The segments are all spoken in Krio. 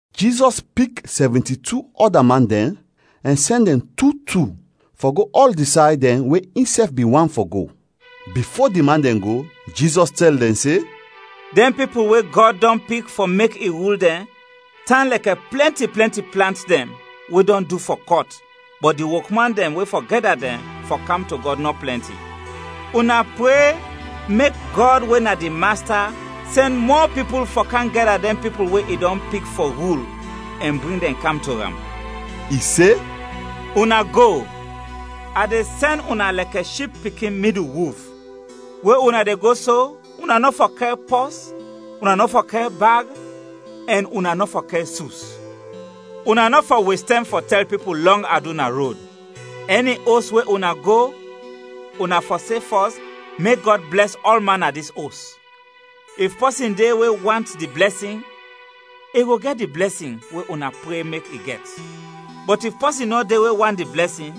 Jizɔs pik sɛvinti-tu ɔda man dɛn ɛn sɛn dɛn tu tu fɔ go ɔl di say dɛn we insɛf bin want fɔ go. Bifo di man dɛn go, Jizɔs tɛl dɛn se, “Dɛn pipul we Gɔd dɔn pik fɔ mek i rul dɛn tan lɛkɛ plɛnti, plɛnti plant dɛn we dɔn du fɔ kɔt, bɔt di wokman dɛn we fɔ gɛda dɛn fɔ kam to Gɔd, nɔ plɛnti. Una pre mek Gɔd we na di Masta sɛn mɔ pipul fɔ kam gɛda dɛn pipul we i dɔn pik fɔ rul, ɛn bring dɛn kam to am.” I se, “Una go! A de sɛn una lɛkɛ ship pikin midul wulf. We una de go so, una nɔ fɔ kɛr pɔs, una nɔ fɔ kɛr bag, ɛn una nɔ fɔ kɛr sus. Una nɔ fɔ wes tɛm fɔ tɛl pipul lɔng adu na rod. Ɛni os we una go, una fɔ se fɔs, ‘Mek Gɔd blɛs ɔlman na dis os!’ If pɔsin de we want di blɛsin, i go gɛt di blɛsin we una pre mek i gɛt; bɔt if pɔsin nɔ de we want di blɛsin,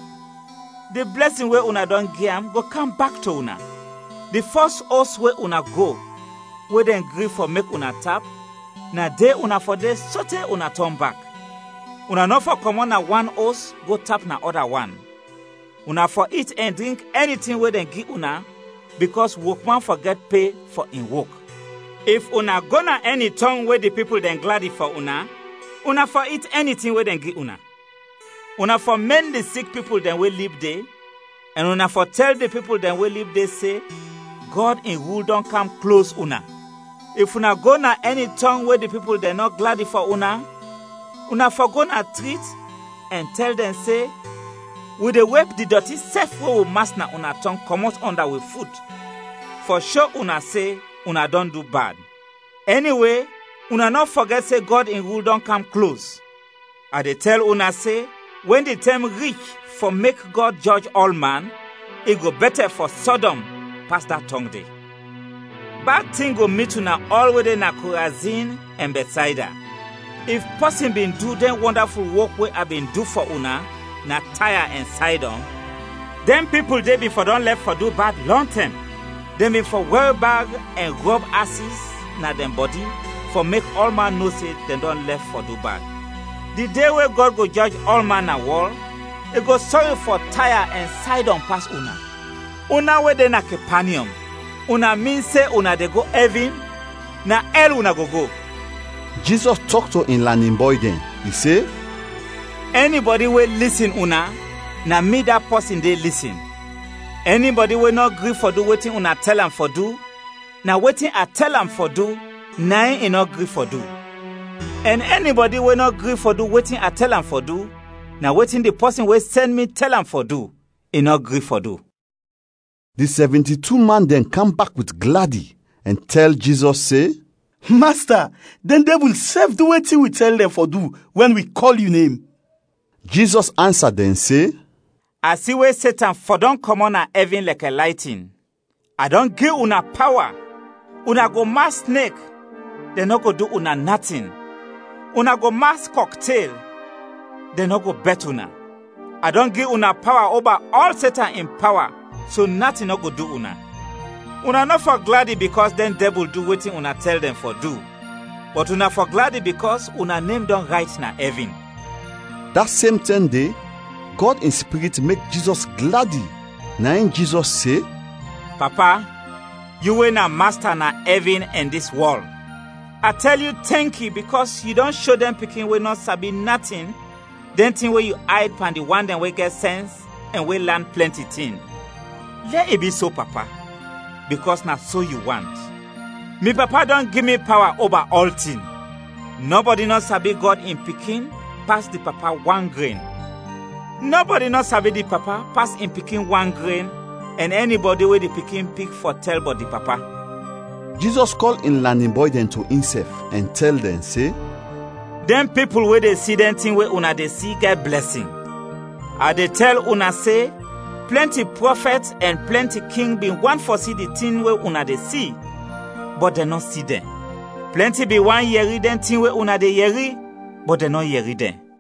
di blɛsin we una dɔn gi am go kam bak to una. Di fɔs os we una go we dɛn gri fɔ mek una tap, na de una fɔ de sote una tɔn bak; una nɔ fɔ kɔmɔt na wan os go tap na ɔda wan. Una fɔ it ɛn drink ɛni tin we dɛn gi una bikɔs wokman fɔ gɛt pe fɔ in wok. If una go na ɛni tɔng we di pipul dɛn gladi fɔ una, una fɔ it ɛni tin we dɛn gi una. Una fɔ mɛn di sik pipul dɛn we lib de, ɛn una fɔ tɛl di pipul dɛn we lib de se, ‘Gɔd in rul dɔn kam klos una.’ If una go na ɛni tɔng we di pipul dɛn nɔ gladi fɔ una, una fɔ go na trit ɛn tɛl dɛn se, ‘Wi de wep di dɔti sɛf we wi mas na una tɔng kɔmɔt ɔnda wi fut fɔ sho una se una dɔn du bad. Ɛniwe, una nɔ fɔgɛt se Gɔd in rul dɔn kam klos!’ A de tɛl una se wɛn di tɛm rich fɔ mek Gɔd jɔj ɔlman, i go bɛtɛ fɔ Sɔdɔm pas da tɔng de. “Bad tin go mit una ɔl we de na Korazin ɛn Bɛtsayda. If pɔsin bin du dɛn wɔndaful wok we a bin du fɔ una, na Taya ɛn Saydɔn, dɛn pipul de bin fɔ dɔn lɛf fɔ du bad lɔntɛm; dɛn bin fɔ wɛr bag ɛn rɔb asis na dɛn bɔdi fɔ mek ɔlman no se dɛn dɔn lɛf fɔ du bad. Di de we Gɔd go jɔj ɔlman na wɔl, i go sɔri fɔ Taya ɛn Saydɔn pas una. Una we de na Kepanyɔm, una min se una de go ɛvin? Na ɛl una go go!” Jizɔs tɔk to in lanin bɔy dɛn. I se, “Ɛnibɔdi we lisin una, na mi da pɔsin de lisin. Ɛnibɔdi we nɔ gri fɔ du wetin una tɛl am fɔ du, na wetin a tɛl am fɔ du, na in i nɔ gri fɔ du; ɛn ɛnibɔdi we nɔ gri fɔ du wetin a tɛl am fɔ du, na wetin di pɔsin we sɛn mi tɛl am fɔ du, i nɔ gri fɔ du.” Di sɛvinti-tu man dɛn kam bak wit gladi ɛn tɛl Jizɔs se, “Masta, dɛn dɛbul sɛf du wetin wi tɛl dɛn fɔ du wɛn wi kɔl yu nem!” Jizɔs ansa dɛn se, “A si we Setan fɔdɔm kɔmɔt na ɛvin lɛkɛ laytin. A dɔn gi una pawa: una go mas snek, dɛn nɔ go du una natin; una go mas kɔktel, dɛn nɔ go bɛt una. A dɔn gi una pawa oba ɔl Setan in pawa so natin nɔ go du una. Una nɔ fɔ gladi bikɔs dɛn dɛbul du wetin una tɛl dɛn fɔ du, bɔt una fɔ gladi bikɔs una nem dɔn rayt na ɛvin.” Da sem tɛm de, Gɔd in Spirit mek Jizɔs gladi, na in Jizɔs se, “Papa, yu we na Masta na ɛvin ɛn dis wɔl! A tɛl yu tɛnki bikɔs yu dɔn sho dɛn pikin we nɔ sabi natin, dɛn tin we yu ayd pan di wan dɛn we gɛt sɛns ɛn we lan plɛnti tin. Lɛ i bi so Papa, bikɔs na so yu want. “Mi Papa dɔn gi mi pawa oba ɔltin. Nɔbɔdi nɔ sabi Gɔd in Pikin pas di Papa wan gren; nɔbɔdi nɔ sabi di Papa pas in Pikin wan gren, ɛn ɛnibɔdi we di Pikin pik fɔ tɛl bɔt di Papa.” Jizɔs kɔl in lanin bɔy dɛn to insɛf ɛn tɛl dɛn se, “Dɛn pipul we de si dɛn tin we una de si, gɛt blɛsin! A de tɛl una se plɛnti prɔfɛt ɛn plɛnti king bin want fɔ si dɛn tin we una de si, bɔt dɛn nɔ si dɛn. Plɛnti bin want yɛri dɛn tin we una de yɛri, bɔt dɛn nɔ yɛri dɛn.”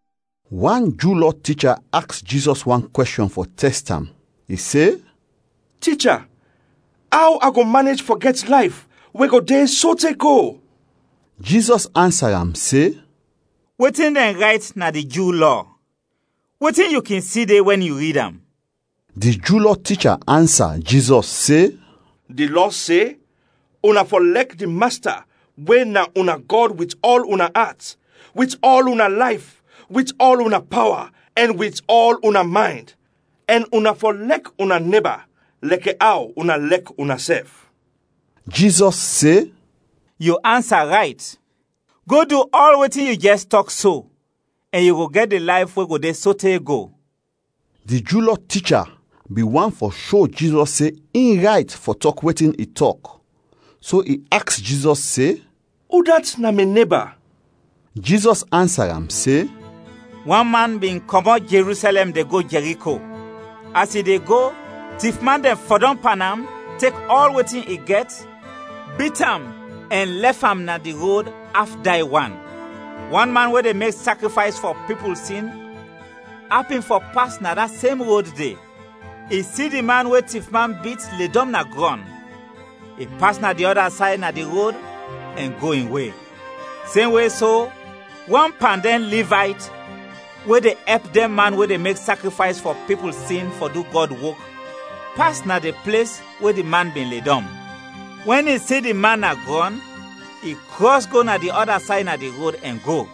Wan Ju Lɔ ticha aks Jizɔs wan kwɛshɔn fɔ tɛst am; i se, “Ticha, aw a go manej fɔ gɛt layf we go de sote go?” Jizɔs ansa am se, “Wetin dɛn rayt na di Ju Lɔ? Wetin yu kin si de wɛn yu rid am?” Di Ju Lɔ ticha ansa Jizɔs se, “Di Lɔ se, ‘Una fɔ lɛk di Masta we na una Gɔd wit ɔl una at, wit ɔl una layf, wit ɔl una pawa, ɛn wit ɔl una maynd’ ɛn ‘Una fɔ lɛk una neba lɛkɛ aw una lɛk unasɛf.’” Jizɔs se, “Yu ansa rayt. Go du ɔl wetin yu jɛs tɔk so ɛn yu go gɛt di layf we go de sote go.” Di Ju Lɔ ticha bin want fɔ sho Jizɔs se in rayt fɔ tɔk wetin i tɔk, so i aks Jizɔs se, “Udat na mi neba?” Jizɔs ansa am se, “Wan man bin kɔmɔt Jerusɛlɛm de go Jɛriko. As i de go tifman dɛn fɔdɔm pan am tek ɔl wetin i gɛt, bit am ɛn lɛf am na di rod af day wan. Wan man we de mek sakrifays fɔ pipul sin apin fɔ pas na da sem rod de. I si di man we tifman bit ledɔm na grɔn, i pas na di ɔda say na di rod ɛn go in we. Semwe so, wan pan dɛn Livayt we de ɛp dɛn man we de mek sakrifays fɔ pipul sin fɔ du Gɔd wok, pas na di ples we di man bin ledɔm. Wɛn i si di man na grɔn, i krɔs go na di ɔda say na di rod ɛn go.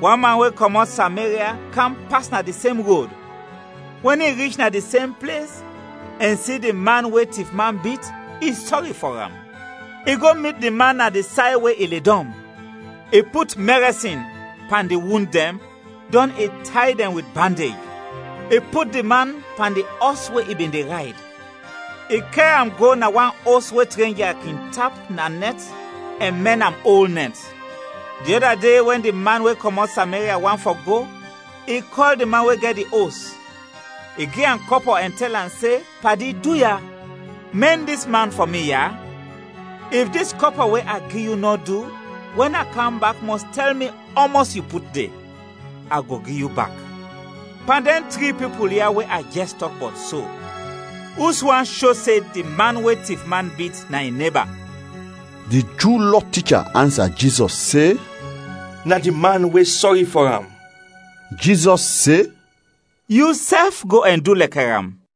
Wan man we kɔmɔt Sameria kam pas na di sem rod. Wɛn i rich na di sem ples ɛn si di man we tifman bit, i sɔri fɔ am. I go mit di man na di say we i ledɔm, i put mɛrɛsin pan di wund dɛn, dɔn i tay dɛn wit bandej. I put di man pan di ɔs we i bin de rayd. I kɛr am go na wan os we trenja kin tap na nɛt ɛn mɛn am ol nɛt. Di ɔda de wɛn di man we kɔmɔt Sameria want fɔ go, i kɔl di man we gɛt di os. I gi am kɔpɔ ɛn tɛl am se, ‘Padi, duya, mɛn dis man fɔ mi ya! If dis kɔpɔ we a gi yu nɔ du, wɛn a kam bak mɔs tɛl mi ɔmɔs yu put de, a go gi yu bak.’” “Pan dɛn tri pipul ya we a jɛs tɔk bɔt so, uswan sho se di man we tifman bit, na in neba?” Di Ju Lɔ ticha ansa Jizɔs se, “Na di man we sɔri fɔ am.” Jizɔs se, “Yusɛf go ɛn du lɛkɛ am.”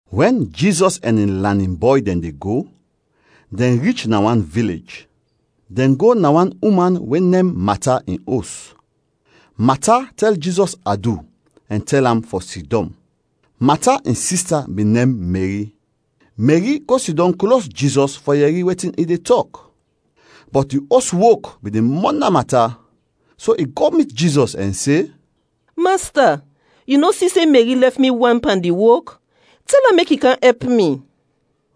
Wɛn Jizɔs ɛn in lanin bɔy dɛn de go, dɛn rich na wan vilej. Dɛn go na wan uman we nem Mata in os. Mata tɛl Jizɔs adu ɛn tɛl am fɔ sidɔm. Mata in sista bin nem Meri. Meri go sidɔm klos Jizɔs fɔ yɛri wetin i de tɔk. Bɔt di os wok bin de mɔna Mata, so i go mit Jizɔs ɛn se, “Masta, yu nɔ si se Meri lɛf mi wan pan di wok? Tɛl am mek i kam ɛp mi!”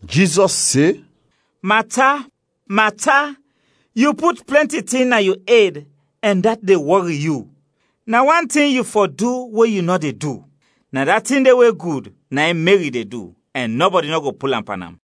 Jizɔs se, “Mata, Mata, yu put plɛnti tin na yu ed ɛn dat de wɔri yu, na wan tin yu fɔ du we yu nɔ de du; na da tin de we gud na in Meri de du ɛn nɔbɔdi nɔ go pul am pan am.”